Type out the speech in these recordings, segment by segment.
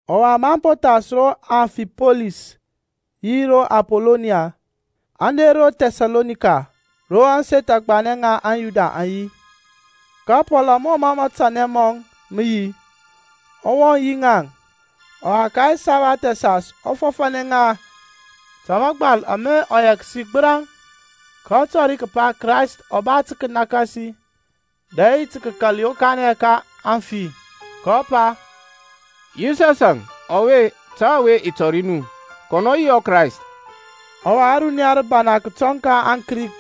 Ɔwa maŋ po thas ro Amfipolis yi ro Apoloniya-e, aŋ der ro Thɛsalonika, ro ȧŋseth agbanɛ ŋa aŋYuda aŋ yi. Ka Pɔlȧŋ, mɔ mə matanɛ mɔŋ mə yi, ɔ wɔŋ yi ŋaŋ, ɔwa ka ɛsabath ɛsas ɔ fɔfȧnɛ ŋa ta mȧgbal ama ɔ yɛksi gbəraŋ, kɔ tɔri kəpa Krayst a ba tə kənakasi, dɛ yi tə kəkal yokanɛ ka aŋfi. Kɔ pa, Yisɔsȧŋ ɔwe ta ɔwe i tɔri nu, kɔnɔ ɔ yi ɔKrayst. Ɔwa ȧruniya rəbana kətɔŋ ka aŋKrik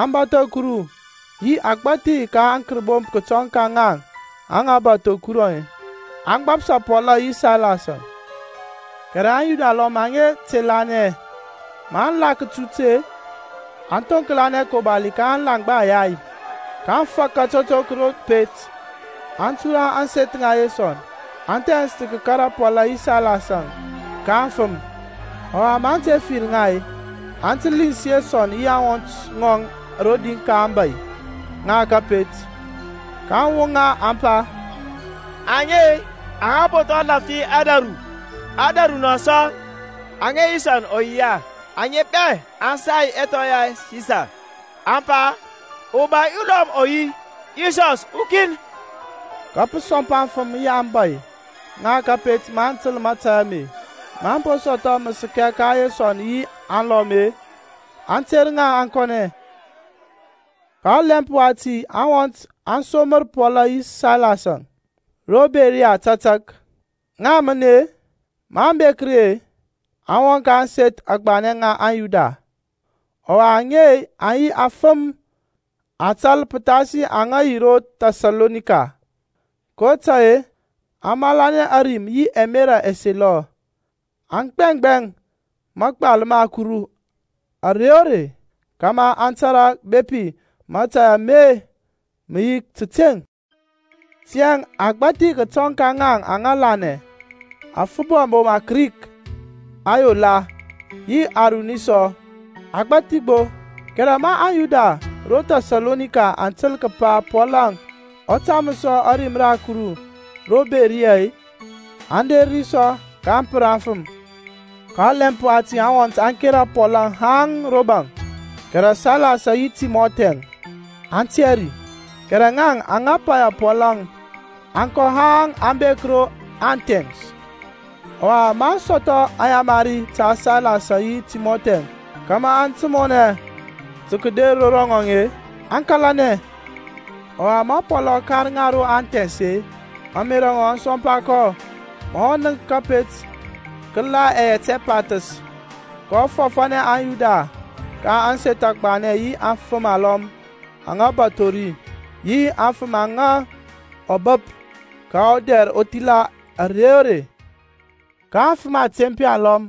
aŋa bȧtho Kuru yi agbȧthi ka aŋkərbomp kətɔŋ ka ŋaŋ aŋa bȧtho Kuru-e, aŋ gbapsa Pɔl yi Sailas-əŋ. Kɛrɛ aŋYuda alɔm aŋa te lanɛ, maŋ la kətut-e, aŋ thoŋklanɛ akobali ka alaŋgba ayay, kaŋ fak atotok ro pet. Aŋ tura ȧŋseth ŋa Yesɔn, aŋ thɛns tə kəkara Pɔlȧŋ yi Sailas-əŋ ka aŋfəm. Ɔwa maŋ te fir ŋa-e, aŋ te lins Yesɔn yi aŋwɔnt alɔm rodi ka aŋbȧy ŋa kȧpet, kaŋ woŋa aŋ pa, Aŋe-e, aŋa po lȧfthi ȧdȧru, aŋ der nɔ sɔ, aŋa Yesɔn ɔ yia; aŋe bɛ aŋ sai ɛthɔ ya Sisar, aŋ pa, Ubȧy ulɔm ɔ yi, Yisɔs ɔkin. Ka pə sɔmpa aŋfəm yi aŋbȧy ŋa kȧpet maŋ təl mȧtȧy ame. Maŋ po sɔthɔ məsɛkɛ ka Yesɔn yi aŋlɔm-e, aŋ ter ŋa aŋ kɔnɛ. Ka ɔlɛmp wati aŋwɔnt aŋ somra Pɔl yi Sailas-əŋ ro Beriya tȧtȧk. Ŋaŋ mən-e, maŋ bek ri-e, aŋ wɔŋ ka ȧŋseth agbanɛ ŋa aŋYuda. Ɔwa aŋe aŋ yi afəm atal pəthasi ŋaŋ aŋa yi ro Thɛsalonika, kotȧy-e aŋ malanɛ ȧrim yi ɛmerȧ ɛselɔ, aŋ gbɛŋgbɛŋ mȧgbal ma Kuru ȧrey o rey, kȧmȧ aŋ tȧrȧ bepi mȧtȧy ame mə yi tȧteŋ. Tiyȧŋ agbȧthi kətɔŋ ka ŋaŋ aŋ lanɛ; aŋfəm abom aKrik ayola, yi aŋruni sɔ, agbȧthi gbo. Kɛrɛ ma aŋYuda ro Thɛsalonika aŋ təl kəpa Pɔlȧŋ ɔ taməs sɔ ȧrim ra Kuru ro Beriya-e, aŋ der ri sɔ kaŋ pər aŋfəm. Ka ɔlɛmp wati aŋwɔnt aŋ kera Pɔlȧŋ haŋ ro baŋ, kɛrɛ Sailas yi Timɔthi-əŋ aŋ tiyȧ ri. Kɛrɛ ŋaŋ aŋa paya Pɔlȧŋ aŋ kɔ haŋ aŋ bek ro Athɛns. Ɔwa maŋ sɔthɔ ayamari ta Sailas yi Timɔthi kȧmȧ aŋ timɔnɛ tə kəder ro ŋɔŋ-e, aŋ kȧlanɛ. Ɔwa ma Pɔlȧŋ ɔ kar ŋa ro Athɛns-e, ȧŋmerȧ ŋɔŋ aŋ sɔmpa kɔ ma ɔ nənk kȧpet kə la yɛt ɛpathəs. kɔ fɔfȧnɛ aŋYuda ka ȧŋseth agbanɛ yi aŋfəm alɔm aŋa bȧtho ri, yi aŋfəm aŋa ɔ bəp ka ɔdɛr ɔthila ȧrey o rey. Ka aŋfəm atempi alɔm,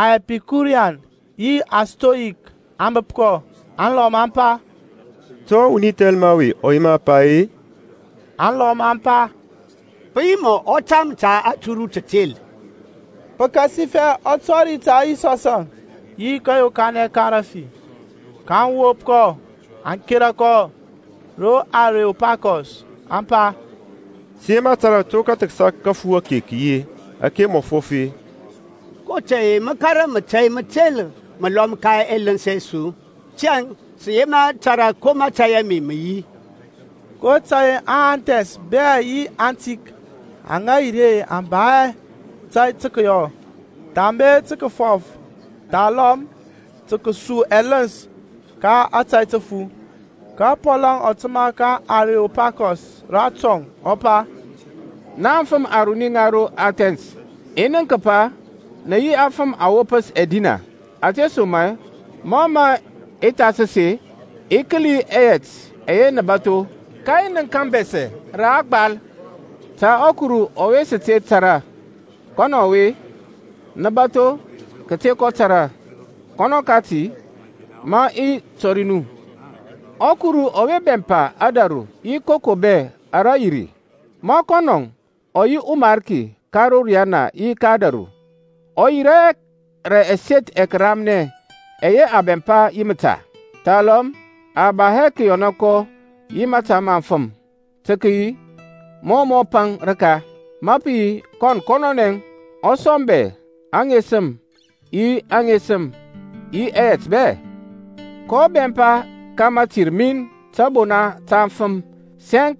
aŋƐpikurian yi aŋStoik aŋ bəp kɔ. Alɔm aŋ pa, To wuni thɛlma ɔwe ɔ yema pa-e? Aŋlɔm aŋ pa, Pə yi mɔ ɔ tam ta aturu tətel, pəkasifɛ ɔ tɔri ta Yisɔsȧŋ yi kȧyokanɛ ka rȧfi. kaŋ wop kɔ aŋ kȧrȧ kɔ ro Areopakɔs, aŋ pa, Sə yema tȧrȧ to kəthəksa kəfu ake kə yi, ȧke mȧ mə fɔf-e? kotȧy-e mə kȧrȧ mȧtȧy mətel məlɔm ka ɛləns ɛ su. Tiyȧŋ sə yema tȧrȧ ko mȧtȧy ame mə yi. (kotȧy-e aŋAthens bɛ yi aŋtik aŋa yi ri aŋ ba hɛ tȧy tə kəyɔ, thambe tə kəfɔf thalɔm tə kəsu ɛləns ka ȧtȧy təfu). Ka Pɔlȧŋ ɔ təmȧ ka aŋAreopakɔs ratɔŋ, ɔ pa, Na aŋfəm aruni ŋa ro Athɛns, i nənk kəpa nə yi afəm awopəs ɛdina. Ȧtesoma-e mȧ mȧ i thasəs-e, i kəli ɛyɛt ɛyɛ nə bȧtho, ka i nənk abɛsɛ ro a gbal, TA ƆKURU ƆWE sə TE TARA. Kɔnɔ ɔwe nə bȧtho kəte kɔ tȧrȧ, kɔnɔ kati mə i tɔri nu. ƆKuru ɔwe bɛmpa ȧdȧru yi koko bɛ ara yi ri, ma kɔnɔ ɔ yi ɔMarki ka ro riyana yi ȧdȧru, ɔ yirȧ hɛ rə ɛseth ɛramnɛ ɛyɛ a bɛmpa yi məta; thalɔm a ba hɛ kəyɔna kɔ yi mȧta ma afəm, tə kəyi mɔ ɔ paŋ rəka, ma pə yi kɔn kɔnɔnɛ ɔ sɔŋ bɛ ɛŋesəm, yi aŋesəm yi ɛyɛt bɛ. kɔ bɛmpa ka mətir min tȧbona ta aŋfəm sɛŋk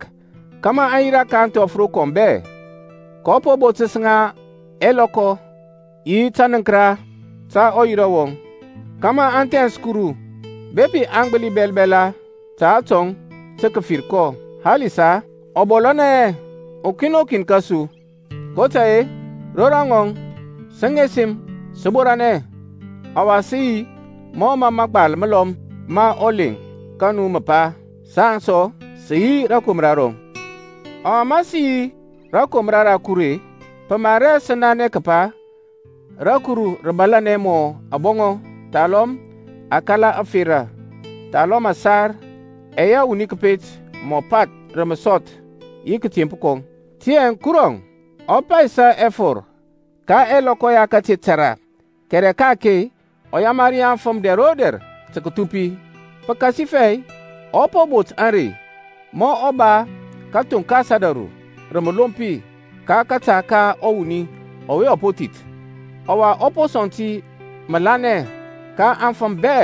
kȧmȧ aŋ yirȧ ka ȧŋthɔf rokɔm bɛ, kɔ po botəs ŋa ɛlɔkɔ yi tənəŋkəra ta ɔyira wɔŋ, kȧmȧ aŋ thɛns Kuru, bepi aŋ gbəli bɛlbɛla ta atɔŋ tə kəfir kɔ, halisa ɔ bɔlȧnɛ hɛ ukin o kin kȧsu. kotȧy-e, ro rɔŋɔŋ sə ŋesəm, sə borȧnɛ ɔwa sə yi, mɔ mə məgbal məlɔm ma ɔleŋ ka nu mə pa, Saŋ sɔ sə yi rȧkomra rɔŋ. Ɔwa ma sə yi rȧkomra ra Kuru-e, pə mar hɛ sə nanɛ kəpa raKuru rə bȧlȧnɛ mɔ abɔŋɔ thalɔm akala ȧferȧ, thalɔm ȧsar ɛyɛ wuni kəpet mɔ path rə məsɔth yi kȧtemp kɔŋ. Tiyȧŋ Kurɔŋ ɔ paysa ɛfɔr ka ɛlɔkɔ ya kate tȧrȧ, kɛrɛ ka-ake ɔ yamari aŋfəm dɛr o dɛr tə kəthupi. Pəkasifɛ ɔ po bot ȧrey ma ɔ ba kəthoŋkas ȧdȧru rə məlompi ka kȧta ka ɔwuni ɔwe ɔ po thith. Ɔwa ɔ po sɔŋ ti məlanɛnɛ ka aŋfəm bɛ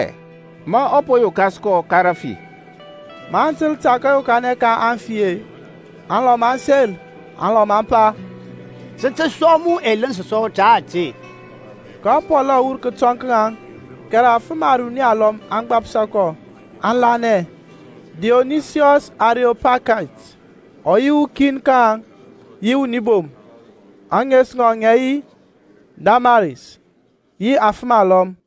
ma ɔ po yokas kɔ ka rafi. Maŋ təl ta kȧyokanɛ ka aŋfi-e, alɔm aŋ sel, alɔm aŋ pa, Sə tə sua mu ɛləns sɔ ta ȧte. Ka Pɔlȧŋ ɔ wur kətɔŋ ka ŋaŋ. Kɛrɛ afəm aruni alɔm aŋ gbapsa kɔ, aŋ lanɛ. Diyonisiyɔs ɔAreyopakait ɔ yi ukin ka ŋaŋ, yi wuni bom, ȧŋes ŋɔŋ ŋə yi Damaris, yi afəm alɔm.